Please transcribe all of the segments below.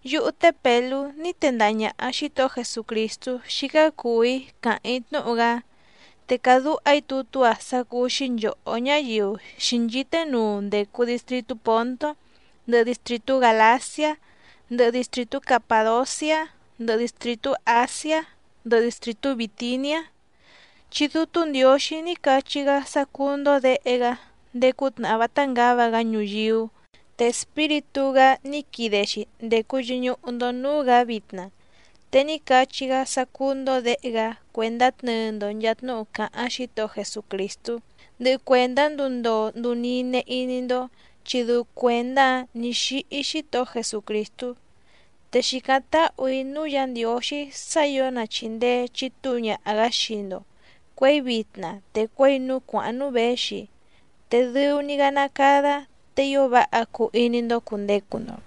Yúhú té Pèlú ní tendaha ñàha Xítohó Jesucrìstú xícá cùu‑í càháⁿ‑í tnúhu‑gá, te càdúha‑í tutú‑a sá cúú‑xí nchòhó ñáyiu xǐnchíté nuu ndècu distritú Pòntó, ndɨhɨ distrìtú Gàlaciá, ndɨhɨ distrìtú Capàdociá, ndɨhɨ distrìtú Àsiá, ndɨhɨ distrìtú Bìtiniá. Chi Dútú Ndiǒxí ní cachí‑gá sá cúú‑ndó děhe‑gá ndéé cútnàhá vátá ngǎva‑gá ñuyíú, te Espíritú‑gá ní quide‑xi ndècu yɨñuhu‑ndo núú‑gǎ vitna. Te ní cachí‑gá sá cúú‑ndó děhe‑gá cuèndá tnɨɨ‑ndo nchàa tnúhu càháⁿ Xítohó Jesucrìstú, ndɨhɨ cuèndá nduu ndoo nduu nine iní‑ndó, chi dɨu cuèndá‑áⁿ nǐ xíhí Xítohó Jesucrìstú. Te xìcáⁿ táhù‑í núú Yǎ Ndiǒxí sá ǐo na chìndee chitúu ñaha‑gǎ xii‑ndo cuěi vitna te cuěi núú cuàháⁿ núú věxi, te dɨu‑ni‑gá ná cádá te ío váha cuu iní‑ndó cùndecu‑ndo.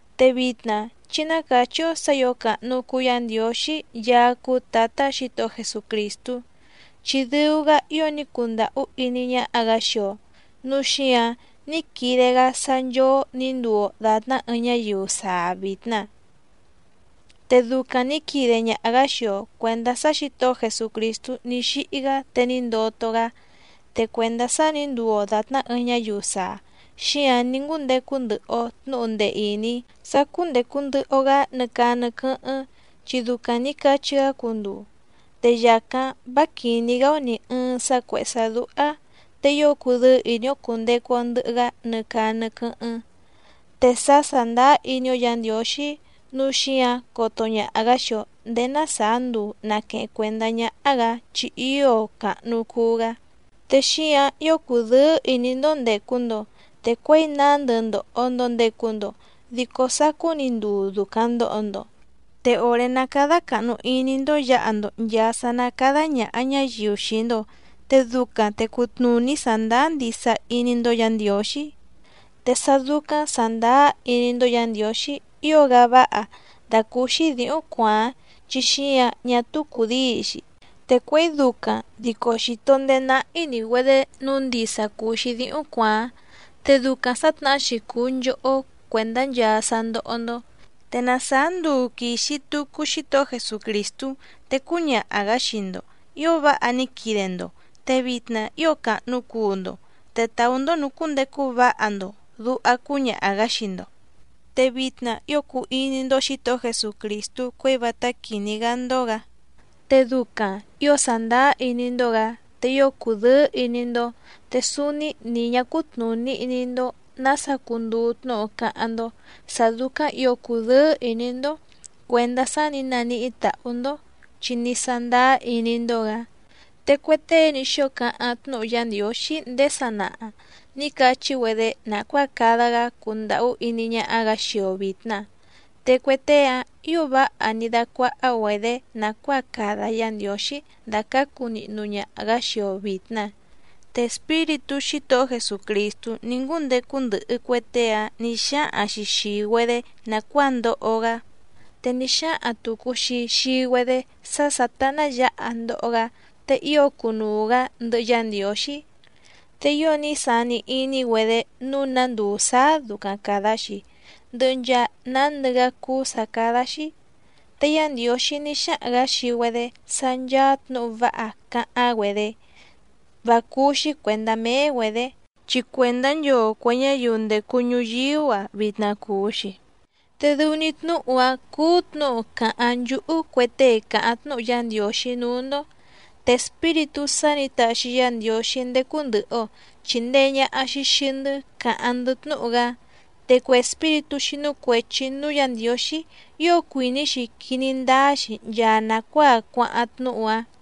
Te vitna chí ná càchí‑ó sǎ ǐo càhnu cuu Yá Ndiǒxí Yaá cúú Tǎtá Xǐtohó Jesucrìstú, chi dɨu‑gá ío ní cundàhú iní ñáhá‑gǎ xii‑o nǔu xíǎⁿ ní quide‑gá sá nchóó nǐ nduu‑o dàtná ɨɨⁿ ñáyiu saa vìtna. Te ducaⁿ nǐ quide ñaha‑gǎ xii‑o cuèndá sá Xǐtohó Jesucrìstú ní xíhí‑gá te ní ndoto‑gá. Te cuèndá sá nǐ nduu‑o dàtná ɨɨⁿ ñáyiu saa, xíǎⁿ ní ngúndecu ndɨhɨ‑o tnǔhu ndee ìní sá cúndècu ndɨhɨ‑o‑gá nɨ caa nɨ quɨ́hɨ́ⁿ, chi ducaⁿ nǐ cachí‑gá cunduu. Te yàcáⁿ vá quìní‑gá‑ó nì ɨɨⁿ sá cuèhé sá dúhá, te ío cudɨ́ɨ́ ìní‑ó cùndecu‑o ndɨhɨ‑gá nɨ caa nɨ quɨ́hɨ́ⁿ. Te sá sàndáá iní‑ó Yǎ Ndiǒxí, núu xíǎⁿ coto ñaha‑gǎ xii‑o ndèé ná sàá nduu nàqueheⁿ cuendá ñáhá‑gǎ chi ío càhnu cuu‑gá. Te xíǎⁿ ío cùdɨ́ɨ́ ìní‑ndó ndècu‑ndo, te cuěi nándɨ ndòho‑ndo ndecu‑ndo dico sacú‑ni nduu ducaⁿ ndòho‑ndo. Te òré ná cádá càhnu iní‑ndó yǎha‑ndo nchàa sá ná càda ñaha ñáyiu xii‑ndo, te ducaⁿ te cutnùní sàndáá ndisa iní‑ndó Yǎ Ndiǒxí, te sá dúcáⁿ sàndáá iní‑ndó Yǎ Ndiǒxí ío‑gá váha dàcúúxí dǐhúⁿ cuàáⁿ chi xíǎⁿ ñá túú cùdíi‑xi. Te cuěi ducaⁿ dico xìto ndeé náhí‑ní‑güedě nǔu ndisa cùu‑xi díhúⁿ cuàáⁿ. Te ducaⁿ sǎtnahá‑xi cùu nchohó cuèndá nchaa sá ndóhó‑ndó, te na sàá nduu quìxi tucu Xítohó Jesucrìstú te cúñaha‑gǎ xii‑ndo: “Ío váha ní quide‑ndo, te vitna ío càhnu cuu‑ndo, te tàú‑ndó nùcúndecu váha‑ndo”, duha cúñaha‑gǎ xii‑ndo. Te vitna ío cùu iní‑ndó Xǐtohó Jesucrìstú cuěi vátá quìní‑gá‑ndó‑gǎ, te ducaⁿ ǐo sàndáá iní‑ndó‑gǎ, te ío cùdɨ́ɨ́ ìní‑ndó te súúní nì ñá cútnùní iní‑ndó nǎsa cunduu tnúhu cáháⁿ‑ndó sǎ dúcáⁿ ǐo cùdɨ́ɨ́ ìní‑ndó cuèndá sá nǐ naníhí tàhú‑ndó, chi ní sándáá iní‑ndó‑gǎ. Te cue tée ní xóo cáháⁿ tnúhu Yá Ndiǒxí ndéé sanaha nǐ cachí‑güedé nàcuáa cada‑gá cundàhú iní ñáhá‑gǎ xii‑o vìtna. Te cue tée‑áⁿ ǐo váha ní dácuáhá‑güedě nàcuáa cada Yá Ndiǒxí dàcácu nihnu ñaha‑gǎ xii‑o vìtna. Te Espíritú Xítohó Jesucrìstú ní ngúndecu ndɨhɨ cue tée‑áⁿ nǐ xáhaⁿ‑xi xìi‑güedé nàcuáa ndoho‑gá, te ní xáhaⁿ tùcu‑xi xii‑güedé sá sǎtá ná yǎha ndoho‑gá te ío cunuu‑gǎ ndɨhɨ Yá Ndiǒxí. Te ío ní sani iní‑güedé nǔu ná nduu sǎá ducaⁿ càda‑xi, ndɨhɨ nchaa nándɨ‑gá cúú sǎ cádá‑xí. Te Yá Ndiǒxí ní xáhaⁿ‑gǎ xii‑güedé sá ncháá tnǔhu váha càháⁿ‑güedé vá cúú‑xí cuèndá méé‑güedě, chi cuèndá nchoo cuè ñáyiu ndècu ñuyíú‑a vitna cùu‑xi. Te dɨu‑ni tnúhu‑áⁿ cúú tnǔhu càháⁿ nchúhú cue tée càháⁿ tnúhu Yá Ndiǒxí núú‑ndó. Te Espíritú sá nǐ taxi Yá Ndiǒxí ndécú ndɨ̀hɨ‑o chindee ñaha‑xi xii‑ndɨ́ càháⁿ‑ndɨ́ tnúhu‑gá. Te cue espíritú xínú cuèchi núú Yǎ Ndiǒxí ío cuìní‑xi quiní ndáá‑xi nchaa nàcuáa cuáháⁿ tnúhu‑áⁿ.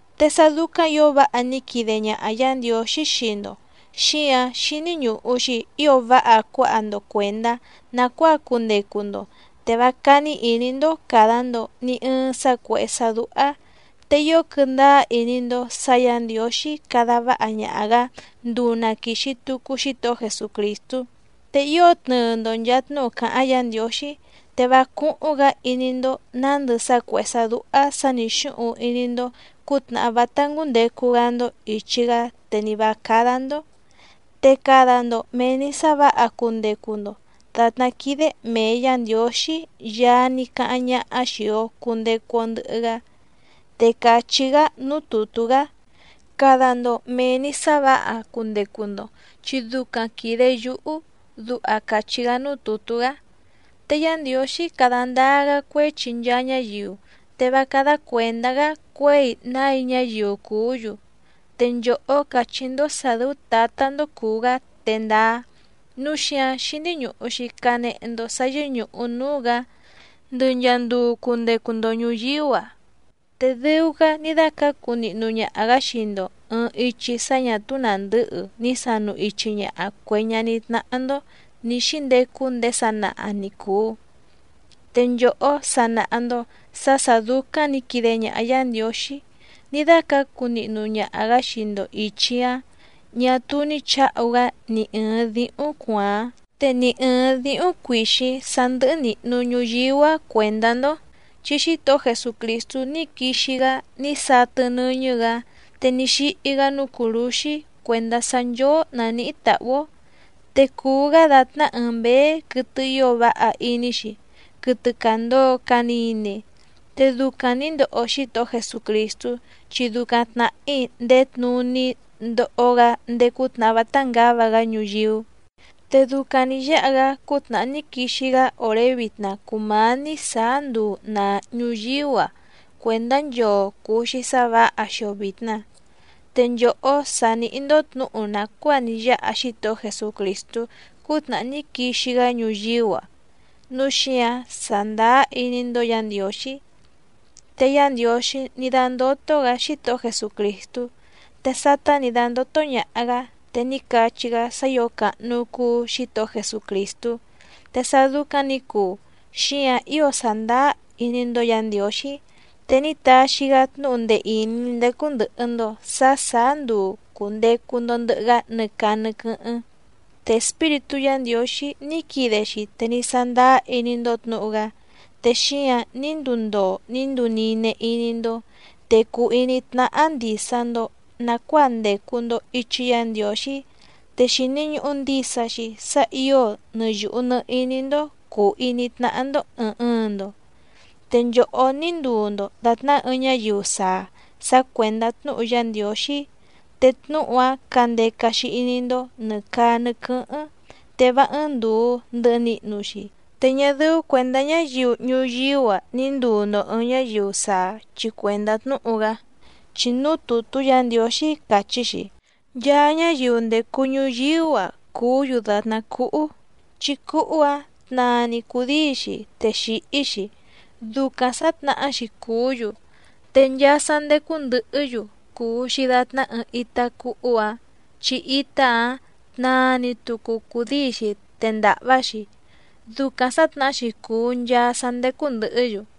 Te sá dúcáⁿ ǐo váha ní quide ñaha Yǎ Ndiǒxí xii‑ndo xíǎⁿ xíní ñùhu‑xi ío váha cuáha‑ndo cuèndá nàcuáa cundecu‑ndo te vá cání ìní‑ndó càda‑ndo ni ɨɨⁿ sá cuèhé sá dúhá, te ío quɨndáá iní‑ndó sǎ Yǎ Ndiǒxí cada váha ñaha‑gǎ nduu na quìxi tucu Xítohó Jesucrìstú. Te ío tnɨɨ‑ndo nchàa tnúhu càháⁿ Yǎ Ndiǒxí, te vá cúhúⁿ‑gǎ iní‑ndó nǎndɨ sá cuèhé sá dúhá sǎ nǐ xúhuⁿ iní‑ndó cǔtnàhá vátá cúndècu‑gá‑ndó ìchi‑gá te ni vǎ cádá‑ndó. Te cada‑ndo mèe‑ni sá vǎha cundecu‑ndo dàtná quídé mèe Yá Ndiǒxí Yaá ní cáháⁿ ñáhá xìi‑o cundecu‑o ndɨhɨ‑gá. Te càchí‑gá núú tùtú‑gá: “Cada‑ndo mèe‑ni sá vǎha cundecu‑ndo, chi ducaⁿ quìde yúhú”, duha càchí‑gá núú tùtú‑gá. Te Yá Ndiǒxí cada ndáá‑gá cuéchi nchaa ñáyiu, te vá cádá cuèndá‑gá cuěi nái ñáyiu cùú‑yu, te nchòhó càchí‑ndó sǎ dɨ́ú Tǎtá‑ndó cùu‑gá te ndáá, núu xíǎⁿ xíní ñùhu‑xi canehe‑ndo sá yɨ́ñùhu núú‑gǎ ndɨ nchàa nduu cundecu‑ndo ñuyíú‑a. Te dɨu‑gá ní dácǎcu nihnu ñaha‑gǎ xii‑ndo ɨ̀ɨⁿ ichi sá ñà túú nàndɨ́hɨ ní sanu ichi ñaha cuè ñaní tnáhá‑ndó nǐ xíndecu ndéé sanaha ni cùu, te nchòhó sa nàha‑ndo sá sǎ dúcáⁿ nǐ quide ñaha Yá Ndiǒxí ní dácǎcu nihnu ñaha‑gǎ xii‑ndo ìchi‑áⁿ ñà túú ní chǎhu‑gá ni ɨ̀ɨⁿ díhúⁿ cuàáⁿ, te ni ɨ̀ɨⁿ díhúⁿ cuìxíⁿ sá ndɨ́hɨ́ nìhnu ñuyíú‑a cuèndá‑ndó. Chi Xítohó Jesucrìstú ní quixi‑gá ní satɨ nɨ́ñɨ́‑gǎ, te ní xíhí‑gá núú cùrúxí cuèndá sá nchóó nàníhí tàhú‑ó, te cùu‑gá dàtná ɨɨⁿ mběé quɨtɨ ío váha iní‑xi, quɨtɨ càndoo canine. Te ducaⁿ nǐ ndoho Xítohó Jesucrìstú, chi ducaⁿ tnàhí ndèé tnuní ndoho‑gá ndéé cútnàhá vátá ngǎva‑gá ñuyíú. Te ducaⁿ nǐ yáha‑gá cútnàhá ní quixi‑gá òré vitna cùmání sǎá nduu nàa ñuyíú‑a cuèndá nchoo cùu‑xi sá vǎha xii‑o vìtna. Te nchòhó sa nìhí‑ndó tnǔhu nàcuáa ní yáha Xítohó Jesucrìstú cútnàhá ní quixi‑gá ñuyíú‑a, núu xíǎⁿ sàndáá iní‑ndó Yǎ Ndiǒxí. Te Yá Ndiǒxí ní dándótó‑gǎ Xítohó Jesucrìstú, te sátá nǐ dándótó ñàha‑gá te ní cachí‑gá sá ǐo càhnu cuu Xítohó Jesucrìstú. Te sá dúcáⁿ nǐ cuu, xíǎⁿ ío sàndáá iní‑ndó Yǎ Ndiǒxí, te ní taxi‑gá tnúhu ndee ìní ndécú ndɨ̀hɨ‑ndo sá sàá nduu cùndecu‑ndo ndɨhɨ‑gá nɨ caa nɨ quɨ́hɨ́ⁿ. Te Espíritú Yǎ Ndiǒxí ní quide‑xi te ní sándáá iní‑ndó tnǔhu‑gá, te xíǎⁿ ní nduu ndoo ní nduu nine iní‑ndó, te cùu iní tnáhá ndìsa‑ndo nacuáa ndècu‑ndo ichi Yá Ndiǒxí, te xìni ñuhu ndisa‑xi sá ǐo nɨ yùhu nɨ iní‑ndó cùu iní tnáhá‑ndó ɨ̀ɨⁿ ɨɨⁿ‑ndo. Te nchòhó ní nduu‑ndo dàtná ɨɨⁿ ñáyiu saa sá cuèndá tnúhu Yá Ndiǒxí, te tnúhu‑áⁿ candeca‑xi iní‑ndó nɨ̀ caa nɨ quɨ́hɨ́ⁿ, te vá ɨ́ɨ́ⁿ ndùu ndɨhɨ nihnu‑xi, te ñá dɨ́ú cuèndá ñáyiu ñuyíú‑a ni ndùu‑ndo ɨɨⁿ ñáyiu saa chi cuèndá tnúhu‑gá. Chi núú tùtú Yǎ Ndiǒxí càchí‑xi: Nchaa ñáyiu ndècu ñuyíú‑a cùú‑yu dàtná cúhú, chi cúhú‑ǎⁿ tnaa‑ni cùdíi‑xi te xìhí‑xi, ducaⁿ sǎtnahá‑xi cùú‑yu. Te nchaa sá ndécú ndɨ̀hɨ́‑yu cùu‑xi datná ɨɨⁿ itá cúhú‑ǎⁿ, chi itá‑áⁿ tnaa‑ni tucu cùdíi‑xi te ndàhvá‑xi, ducaⁿ sǎtnahá‑xi cùu nchaa sá ndécú ndɨ̀hɨ́‑yu.